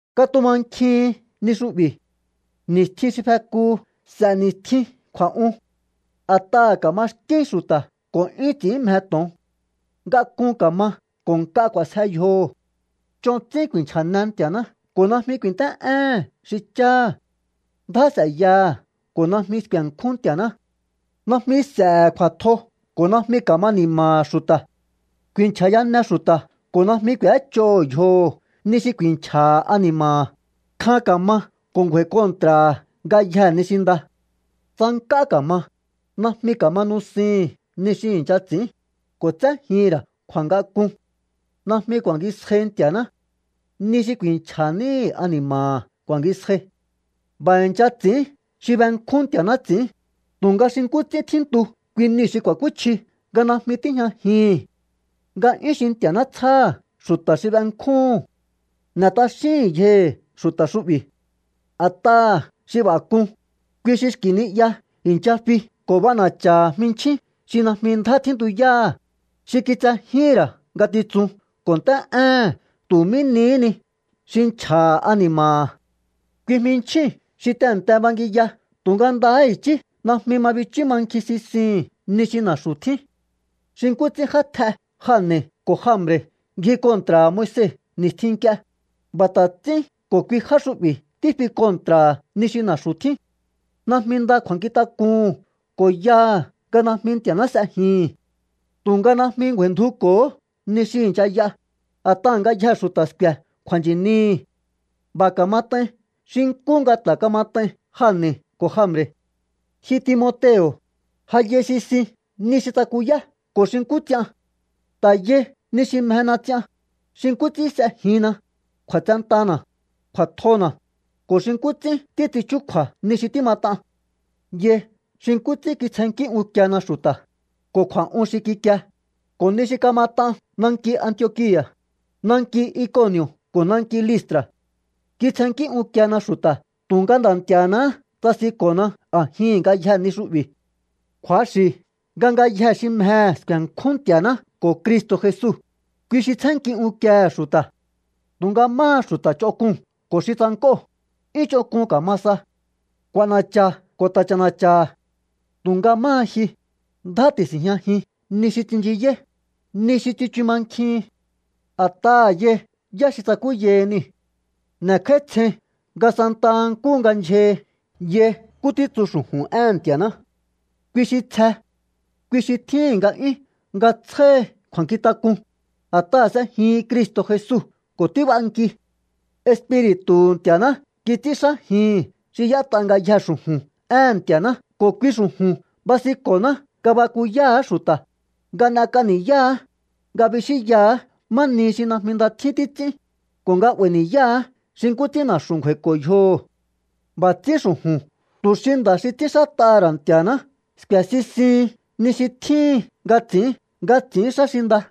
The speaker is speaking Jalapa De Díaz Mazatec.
Katumankjihin ni xu'bi̱. Ni̱stjin xi fekuhu s'e̱ ni̱stjin kju̱a̱'un. A̱t'aha̱ ka̱maxkín xu̱ta̱ ko̱ 'yún ts'i̱ín mje to̱on. Ngak'un ka̱ma ko̱ nk'a k'u̱a̱sje yjoho̱. Ch'on ts'ín ku̱i̱nchja̱ne Nti̱a̱ná ko̱ najmi ku̱i̱nt'é'éhe̱n xi cháha̱. Ndjá s'e̱yaha̱ ko̱ najmi sku̱e̱nkjún Nti̱a̱ná. Najmi s'e̱he̱ kju̱a̱tjo ko̱ najmi ka̱ma ni̱ma̱ha̱ xu̱ta̱. Ku̱i̱nchja̱yane xu̱ta̱ ko̱ najmi k'u̱éch'oho̱ yjoho̱ ni xi ku̱i̱nchja̱ha̱ ani̱ma̱ha̱. Kjan ka̱ma ko̱ ngju̱a̱i̱ kontra̱ha̱ ngayjee̱ ni xi nda. Tsank'á ka̱ma, najmi ka̱ma nusihi̱n ni xi i̱ncha ts'i̱ín, ko̱ tséjihi̱n ra̱ kju̱a̱ngak'un. Najmi ku̱a̱ngisjai Nti̱a̱ná. Ni xi ku̱i̱nchja̱ níhi̱ ani̱ma̱ha̱ ku̱a̱ngisjai. B'a̱ i̱ncha ts'i̱ín xi benkjún Nti̱a̱ná ts'i̱ín, tu̱nga xi nkú ts'ín tjíntu kui niu̱ xi ku̱a̱kúchji nga najmi tíjñajihi̱n nga'yún xi Nti̱a̱ná tsjáha̱ xu̱ta̱ xi benkjúhu̱n. N'e̱ t'axíhi̱n yjohi̱ xu̱ta̱ xu'bi̱. A̱t'aha̱ xi b'a̱ k'un, kui xi xki̱ ni'ya i̱ncha fi ko̱ b'ana̱cha̱ha̱ jminchjín xi najmi ndjá tjíntuyáha̱, xi kitsejíhi̱n ra̱ ngatitsun ko̱ nt'é'éhe̱n tu̱ mí nihí ni xi nchja̱ha̱ ani̱ma̱ha̱. Kui jminchjíu̱n xi tehe̱nte bangiya tu̱nga ndahá i̱chí najmi ma bichú mankjin sisihi̱n ni xi na̱xu̱ tjín. Xi nkú ts'ín játj'e Jane̱ ko̱ Jambre̱ ngji kontra̱ha̱ Moise ni̱stjin nk'ie, b'a̱ ta̱ ts'ín ko̱ kui já xu'bi̱ tífi kontra̱ha̱ ni xi na̱xu̱ tjín. Najmi nda kju̱a̱nkjintak'uhu̱n ko̱ yaha̱ nga najmi Nti̱a̱ná s'ejihi̱n. Tu̱nga najmi ngju̱a̱i̱ndjuko̱hó ni xi i̱ncha y'a, a̱t'aha̱ ngayjee̱ xu̱ta̱ sku̱e̱ kju̱a̱nchi̱nihi̱. B'a̱ ka̱mat'ain xi nkú nga ta̱ kamat'ain Jane̱ ko̱ Jambre̱. Ji Timoteo̱, ja yai sisin ni xi tsakuyá ko̱ xi nkú ts'ian. Ta̱ yai ni xi mjena ts'ian, xi nkú ts'ín s'ejinna, kju̱a̱tsentana̱, kju̱a̱tjona̱, ko̱ xi nkú ts'ín títs'in chúkju̱a̱ ni xi tímat'an. Yai xi nkú ts'ín kitsjennkí unkiena xu̱ta̱, ko̱ kju̱a̱'un xi kikie, ko̱ ni xi kamat'an nanki Antiokia̱, nanki Ikoni̱o̱ ko̱ nanki Listra̱. Kitsjennkí unkiena xu̱ta̱ tu̱nga Nda̱ Nti̱a̱náhá tsasinko̱na a̱jihi̱n ngayjee̱ ni xu'bi̱. Kju̱axi̱ nga ngayjee̱ xi mjehe̱ sku̱e̱nkjún Nti̱a̱ná ko̱ Cristo̱ Jesu, kui xi tsjénnki unkiehe̱ xu̱ta̱. Tu̱nga máha xu̱ta̱ ch'onk'uu̱n ko̱ xi tsank'óo̱, 'yún ch'onk'un ka̱ma sa. K'u̱a̱na̱cha̱ ko̱ ta̱ ch'a̱na̱cha̱ha̱. Tu̱nga máha ji, ndjá ti̱si̱njñajin ni xi tsinchiyáí, ni xi tsichu mankjihin. A̱t'aha̱ yai yá xi tsakúyahi niu̱. N'e̱kj'áítsjein nga santa nkúhu nga ndyjahi yai nkú títsu xu̱ju̱n éhe̱n Nti̱a̱ná. Kui xi tsje. Kui xi tjíhi̱n nga'yún nga tsjáhi kju̱a̱nkjintak'un, a̱t'aha̱ s'ejihin Cristo̱ Jesu ko̱ tíb'anki. Espiri̱tu̱hu̱ Nti̱a̱ná kits'ínxájihi̱n xi y'ét'a ngayjee̱ xu̱ju̱n éhe̱n Nti̱a̱ná ko̱ kui xu̱ju̱n basinko̱ná nga bakuyáha̱á xu̱ta̱, nga n'ek'a ni̱yáha̱á, nga bixínyaha̱á má nihi xi najmi nda tjín títs'ín, ko̱ nga 'ba̱i̱ ni̱yáha̱á xi nkú ts'ín na̱xu̱ ngju̱a̱i̱ko̱ yjoho̱. B'a̱ ts'ín xu̱ju̱n tu̱ xi nda̱ xi ts'ínxát'aha̱ ra̱ Nti̱a̱ná sku̱e̱ sisihin ni xi tjíhin nga ts'i̱ín nga ts'i̱ín xá xi nda.